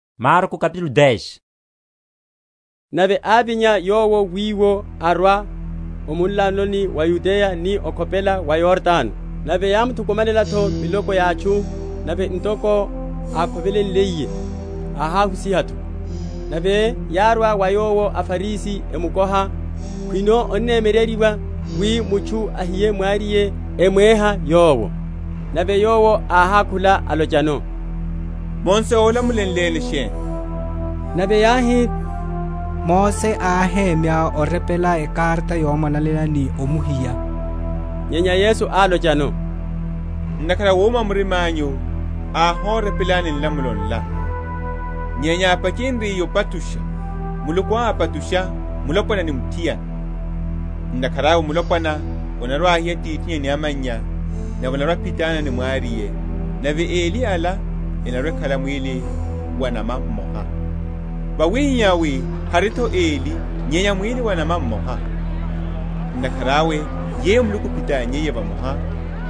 Ehimwalane mulopwana ni mwariye. Nave ávinya Yowo wiwo, arwa o munlanoni wa Yudeya ni okhopela wa Yordano; nave yámuthukumanela’tho miloko ya atchu; nave ntoko ákhovelenliye, áháhusiha’tho. Nave yárwa wa Yowo aFarisi emukoha khwino onnemyereryiwa wi mutchu ahiye mwariye, emwéha Yowo. Nave Yowo áhákhula, alochano, Mose ólamulenleni sheni? Nave yáhi, Mose áhemya orepela ekarata yomwalanela, ni omuhiya. Nyenya Yesu álochano, Ntakhara a wuma wa mirima’nyu áhorepelani nlamulo nla. Nyenya ápachenryiye opachusha, Muluku ápachusha mulopwana ni muthiana. Ntakhara awe mulopwana anarwa‐ahiya atithinnya ni amannya, nave anarwa‐aphitana ni mwariye; nave eli ala enarwa‐ekhala mwíli wa’nama mmoha; wawihihá wi hari’tho eli nyenya mwíli wa’nama mmoha. Ntakhara awe yeyo Muluku áphitannyiye vamoha,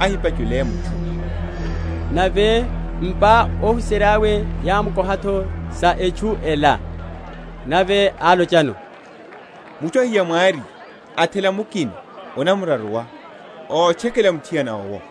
ahipachule mutchu. Nave m’pa óhuserya’we yámukoha’tho sa etchu ela. Nave álochano, Mutchu ahiya mwariye, athela mukina, anamraruwa, otchekela muthiana owo;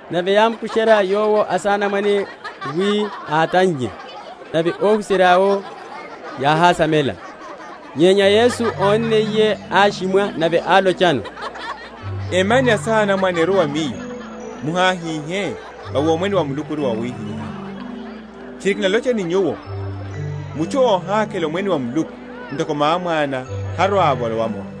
Nave yámukusherya Yowo asanamwane wi átannye; nave óhuserya’wo yáhásamela. Nyenya Yesu ónniye áshimwa, nave alochano, Emyani asanamwane erwe wa Miyo; muháhihe, vawi Omwene wa Muluku ori wa awihiha. Tchiri kinalocha ni nyuwo, Mutchu óhakhela Omwene wa Muluku ntoko mwá‐mwana, harwa‐avolowa’moru.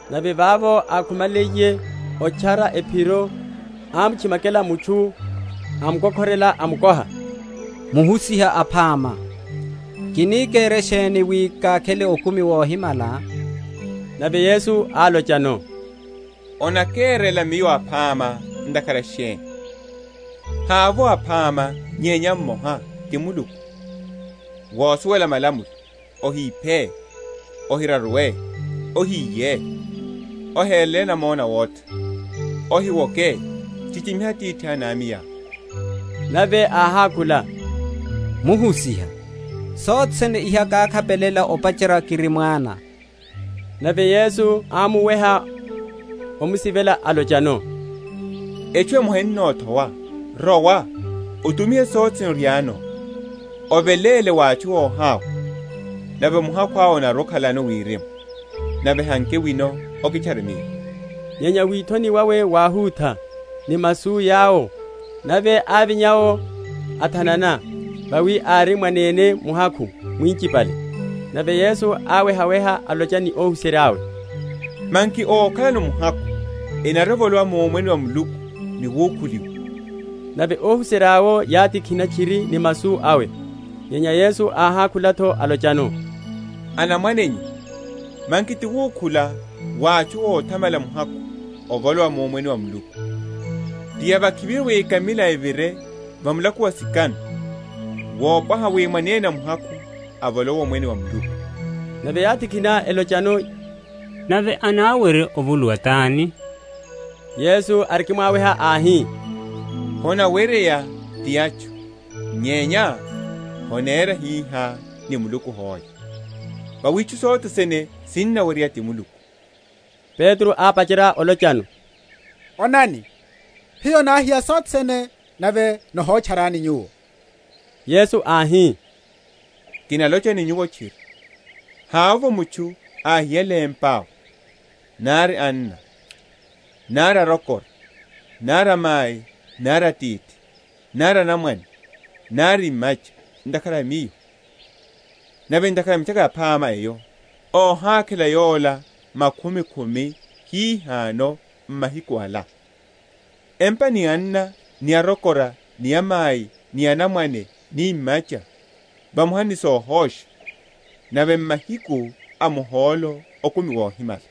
Nave vavo ákhumaliye otchara ephiro, ámutchimakela mutchu, amukokhorela, amukoha, Muhusiha aphama, kini kere sheni wi kákhele okumi wohimala? Nave Yesu álochano, Onakerela Miyo aphama ntakhara sheni? havovo aphama nyenya mmoha, ti Muluku. Wosuwela malamulo, Ohiphe, Ohiraruwe, Ohiye, Ohere namona awotha, Ohiwoke, Chichimiha atithá ni amayá? Nave áhákhula, Muhusiha, sothene iha kákhapelela opacherya kiri mwana. Nave Yesu ámuweha, amusivela, alochano, Etchu emoha ennothowa; rowa, otumihe sothe sene oriáno, oveléle wa atchu óhawa, nave muhakhu onarwa‐okhalano wirimu; nave hanke wino, kitchare Miyo. Nyenya withoni wawe wáhutha ni masu yawo, nave ávinya’wo óthanana; vawi ári mwanene muhakhu mwinchipale. Nave Yesu áwehaweha, alocha ni óhuserya’we, Manki ókhalano muhakhu enarwa‐evolowa mu Omwene wa Muluku ni wukhuliwa! Nave óhuserya’wo yátikhina tchiri ni masu awe. Nyenya Yesu áhákhula’tho alochano, Anamwanenyu, manki ti wukhula wa atchu óthamala muhakhu ovolowa mu Omwene wa Muluku! Ti yavakhiviru wi ekamila evire va mulako wa sikano wopwaha wi mwanene muhakhu avolowe mu Omwene wa Muluku. Nave yátikhina, elochano, Nave anawerya ovuluwa tani? Yesu arikimwaweha áhi, Honaweryeya ti atchu, nyenya honera hihá ni Muluku hoe; vawi itchu sothe sene sinaweryeya ti Muluku. Petro ápacherya olochano, Onani, hiyo náhiya sothe sene nave nihotcharani Nyuwo. Yesu áhi, Kinalocha ni nyuwo tchiri, Havovo mutchu áhiyale empa, nari anna, nari arokora, nari amai, nari atithi, nari anamwane, nari imacha, ntakhara a Miyo, nave ntakhara a Mitchaka Yaphama eyo, óhákhela yola makhumi khumi hihano m’mahiku ala, empa, ni anna, ni arokora, ni amai, ni anamwane, ni imacha vamoha ni sohosha; nave m’mahiku a muhólo okumi wohimala.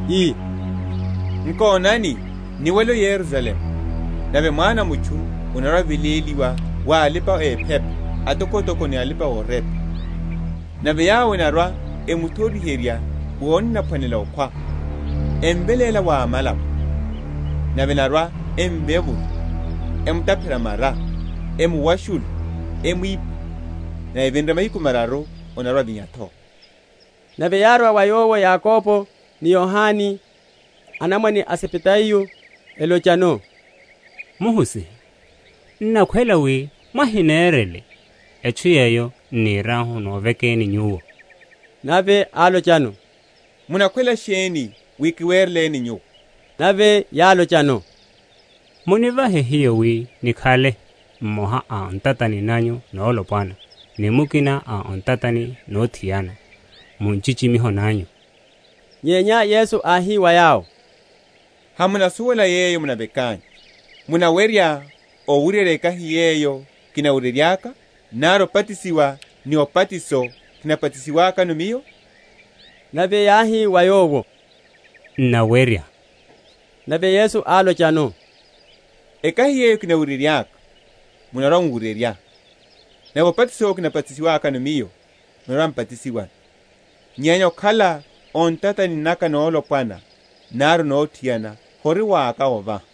ii, Nkonani niwele o Yerusalemu; nave Mwana a mutchu anarwa‐aveléliwa wa alipa‐ephepa atokotoko ni alipa‐orepa; nave yawo enarwa‐emuthoriherya wi anaphwanela okhwa, emveléla wa amalapo. Nave enarwa‐emvevula, emutaphela mara, emuwashula, emwipha; nave evinre mahiku mararu anarwa‐avinya’tho. Nave yárwa wa Yowo Yakobo ni Yohane, anamwane a Zebedayo, elochano, Muhusiha, n’nakhwela wi mwahinerele etchu yeyo n’niriahu novekeni Nyuwo. Nave álochano, Munakhwela sheni wi kiwereleni nyuwo? Nave yálochano, Munivahe hiyo wi nikhale mmoha o ntatani nanyu nolopwana ni mukina o ntatani nothiana, mu nchichimiho nanyu. Nyenya Yesu áhi wa yawo, Hamunasuwela yeyo munavekanyu. Munawerya owuryerya ekahi yeyo kinawuryeryaka? nari obatisiwa ni obatiso kinabatisiwakano Miyo? Nave yáhi wa Yowo, N’nawerya. Nave Yesu álochano, Ekahi yeyo kinawuryeryaka, munarwa‐muwuryerya, nave obatiso yowo kinabatisiwakano Miyo, munarwa‐mubatisiwano; nyenya okhala o ntatani naka nolopwana nari nothiana hori waka ovaha;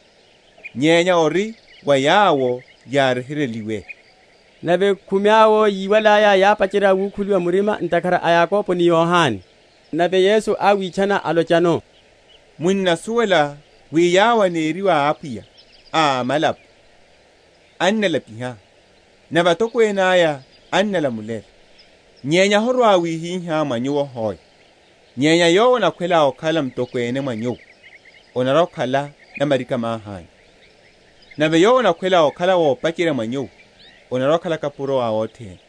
nyenya ori wa yawo yáryeheryeliwe. Nave khumi awo yíwalaya, yápacherya wukhuliwa murima ntakhara a Yakobo ni Yohane. Nave Yesu áwitchana, alochano, Munnasuwela wi yawo eneriwa apwiya a amalapo ennálapiha; nave atokwene aya ennálamulela. Nyenya horwa‐wihihá mwa nyuwo hoe; nyenya yowo anakhwela okhala mutokwene mwa nyuwo, anarwa‐akhala namarika‐mahi anyu; nave yowo anakhwela okhala ópacherya mwa nyuwo, anarwa‐akhala kapuro a othene.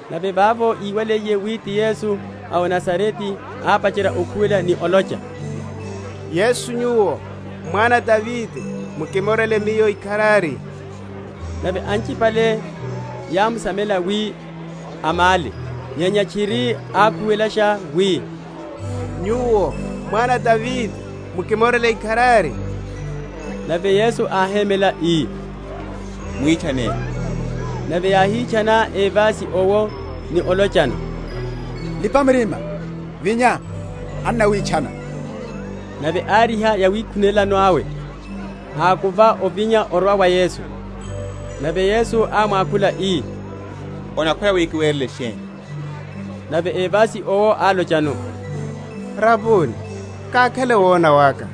Nave vavo íwaliye wi ti Yesu a o Nazarete, ápacherya okhuwela ni olocha, Yesu, Nyuwo, Mwana a Davide, mukimorele miyo ikharari. Nave anchipale yámsamela wi amále; nyenya tchiri ákhuwelasha wi, Nyuwo, Mwana a Davide, mukimorele ikharari. Nave Yesu áhémela, ii, Mwitchaneni. Nave yáhítchana évasi owo ni olochano; Lipa murima, vinya, annawitchana. Nave áriha yawikhunelano awe, ákuva ovinya, arwa wa Yesu. Nave Yesu ámwakhula, ii, Onakhwela wi kiwerele sheni? Nave évasi owo álochano, Raboni, kákhele wona waka.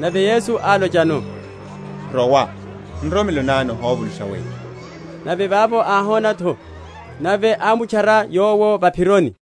Nave Yesu álochano, Rowa; nroromelo ná nihovulusha weyo. Nave vavo áhona’tho; nave ámutchara Yowo va’phironi.